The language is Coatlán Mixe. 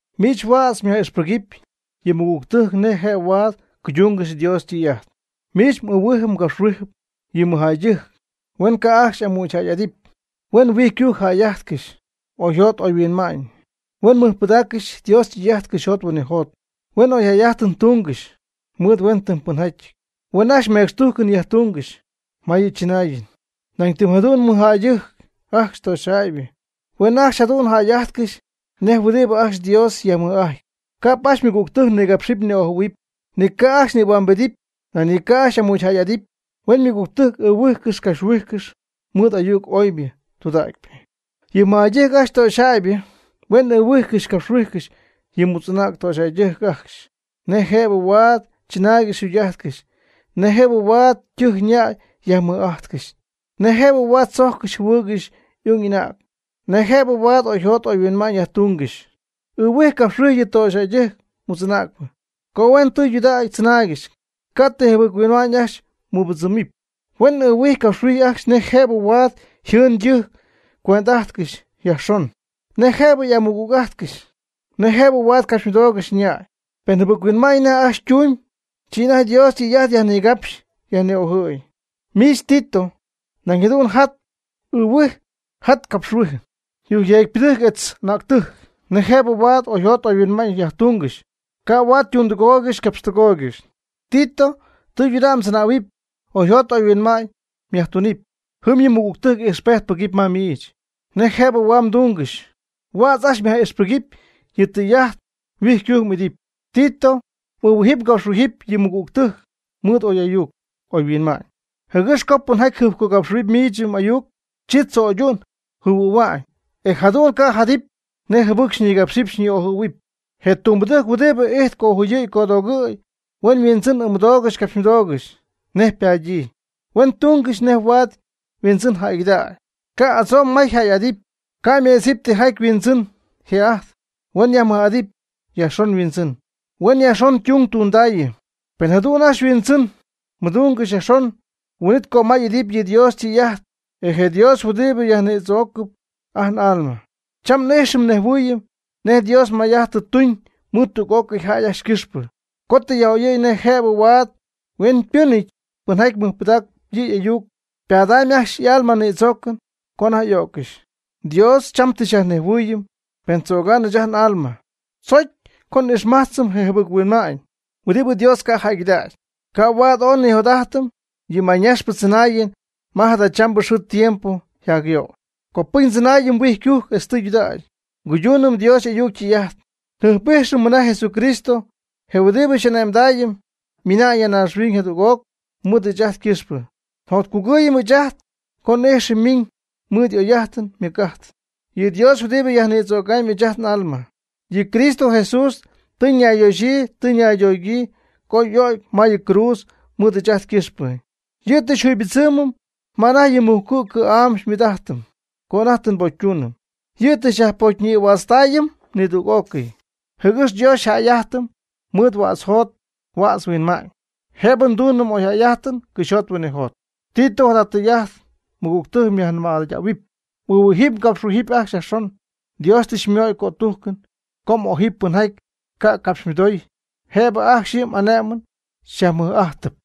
Miich huädz myaj'ixpɨgɨpy yɨ mɨgügtɨjc nej jëb huaad cuydungɨxy Dios ytɨy'ajt. Miich m'ɨɨhuijɨp mgapxhuijɨp yɨ mɨjjäydɨjc huen ca' ajcxy y'amügyjäy'adɨpy; huen huijycujc jäy'ajtcɨxy; huen mɨɨd'ajtcɨxy oyjot oyhuinma'ñ; huen mɨjpɨdaaccɨxy Dios ytɨy'ajt cɨxyjot huinɨjot; huen oyjäy 'ajtɨn tungɨxy mɨɨd huentɨmypɨnjäyɨty; huen ajcxy mecxtujcɨn yajtungɨxy ma yɨ chɨnaayɨn. Nañytɨmyjadu'n mɨjjäydɨjc ajcxy töxyjäybɨ huen ajcxy jadu'n jäy'ajtcɨxy nej huɨdibɨ ajcxy Dios yajmɨj'ajtp; ca'p ajcxy ymɨgügtɨjc nigapxɨp ni'ojɨ̈huɨpy, ni ca' ajcxy nïhuambedɨpy; nañ ni ca' ajcxy y'amügyjäy'adɨpy; huen ymɨgügtɨjc ɨɨhuijcɨxy capxhuijcɨxy mɨɨd ayuc oybɨ tudägypɨ. Yɨ mɨjjäydɨjc ajcxy töxyjäybɨ huen ɨɨhuijcɨxy capxhuijcɨxy yɨ mutz'anäg töxyjäydɨjc ajcxy nej jëb huaad chɨnaaygɨxy yjugy'ajtcɨxy; nej jëb huaad ytɨjc ñäy yajmɨj'ajtcɨxy; nej jëb huaad tzojccɨxy jɨhuɨɨygɨxy y'ung y'anäg; nej jëb huaad oyjot oyhuinma'ñ yajtungɨxy. Ɨɨhuij capxhuij yɨ töxyjäy mutz'anäcpɨ co huen tɨydudägy chɨnaaygɨxy, ca' ti jɨbɨc-huinma'ñ ajcxy mɨbɨdzɨmɨpy. Huen ɨɨhuij capxyhuij ajcxy nej jëb huaad yjɨɨn ytɨjc cuend'ajtcɨxy yajxon; nej jëbɨ y'amɨgüg'ajtcɨxy, nej jëb huaad capxymɨdoogɨxy ñäy. Pen jɨbɨc-huinma'ñ anajty ajcxy ytumyb, chi anajty Dios ytɨy'ajt yajnigapxy yajni'ojɨ̈y. Miich Tito, nañ jadu'n jaty ɨɨhuij jaty capxhuij yujcyeecpɨdɨjc etz anäctɨjc nej jëb huaad oyjot oyhuinma'ñ yajtungɨxy, ca' huaad ytundɨgooygɨxy ycapxtɨgooygɨxy. Tito, tɨydudägy mdzɨnähuɨpy, oyjot oyhuinma'ñ myajtunɨpy. Jɨm yɨ mɨgügtɨjc ijxpejt pɨgɨpy ma miich, nej jëb huaad ytungɨxy. Huädz ajcxy myaj'ixpɨgɨpy yɨ tɨy'ajt, huijycujc m'idɨpy. Tito, m'ɨɨhuijɨp mgapxhuijɨp yɨ mɨgügtɨjc mɨɨd oy'ayuc oyhuinma'ñ, jɨgɨx co pɨnjäy jɨjpcogapxɨ̈huaanɨp miich m'ayuc, chi tzo'ydu'ñ jɨhuɨ̈hua'ñ, e jadu'n ca' jadɨpy nej jɨbɨc xyñigápxcɨxɨpy xyñi'ojɨ́ɨygɨxɨpy. Je tumbɨdɨjc huɨdibɨ ijtp cojuyɨ̈y codoogɨ̈y, huen yhuindzɨn ɨɨmɨdoogɨxy capxymɨdoogɨxy nej ypadyii. Huen tungɨxy nej huaad yhuindzɨn jäygɨdägy, ca' adzo'nmay yjäy'adɨpy. Ca' meedzɨp tijaty yhuindzɨn yjë'ajtpy, huen yajmɨj'adɨpy yajxon yhuindzɨn, huen yajxon ytung tundaayɨ. Pen jadu'n ajcxy yhuindzɨn mɨdungɨxy yajxon, huin'it cömay y'idɨpy yɨ Dios ytɨy'ajt, je Dios huɨdibɨ xyajnïdzoocɨm ajt n'alma. Cham n'ijxɨm nnejhuɨɨyɨm nej Dios may'ajt tɨ tuñ mɨɨd tüg'ócɨy jäy ajcxy ycɨxpɨ, co tɨ yaj'oyɨ̈y nej jëb huaad hueñypɨnɨty pɨnjaty mɨjpɨdaacɨp yɨ' y'ayuc, ypadamyb ajcxy y'alma ñïdzoocɨn co anajty y'o'ccɨxy. Dios cham tɨ xyajnejhuɨɨyɨm pen tzögamb ɨɨch ajt n'alma, chojcpy co n'ixmajtzɨm je jɨbɨc-huinma'ñ huɨdibɨ Dios ca' jäygɨdägy. Ca' huaad ooy nijot'ajtɨm yɨ mayñaxpɨ tzɨnaayɨn ma jadachambɨ xɨɨ tiempo yjacyöy. Copɨcy ndzɨnaayɨm huijycujc etz tudägy, e nguydunɨm Dios y'ayuc ytɨy'ajt. Njɨjp'ijxɨm mɨna Jesucristo, je huɨdibɨ xy'ane'mdaayɨm, ymiina'ñ ya naaxhuiñ jadüg'oc mɨɨd ɨɨch ajt ycɨxpɨ. Njotcugɨɨyɨm ɨɨch ajt co n'ijxɨm ymiiñ mɨɨd y'oy'ajtɨn ymɨc'ajtɨn, yɨ Dios huɨdibɨ yajnïdzögam ɨɨch ajt n'alma. Yɨ Cristo Jesús tɨ ñayyoxyii tɨ ñaydoogyii co y'o'cy ma yɨ cruudz mɨɨd ɨɨch ajt ycɨxpɨ. Yɨ' tɨ xyjuybɨdzɨmɨm ma anajty yɨ mujcu' cɨ̈'am xymɨɨd'ajtɨm, co anajty tɨ nbocytuunɨm. Yɨ' tɨ xyajpocyñïhuätztaayɨm nidüg'ócɨy, jɨgɨx Dios xyjäy'ájtɨmɨp mɨɨd huädz jot huädz huinma'ñ, jëb nduunɨm oyjäy'ajtɨn cɨxyjot huinɨjot. Tito, jada tɨy'ajt mɨgügtɨjc myajnɨmaydähuɨpy. M'ɨɨhuijɨp mgapxhuijɨp ajcxy yajxon. Dios tɨ xymöy cötujcɨn co m'ojɨpy pɨnjaty xycacapxmɨdoob, jëb ajcxy yɨ m'ane'mɨn xyajmɨj'ajtɨp.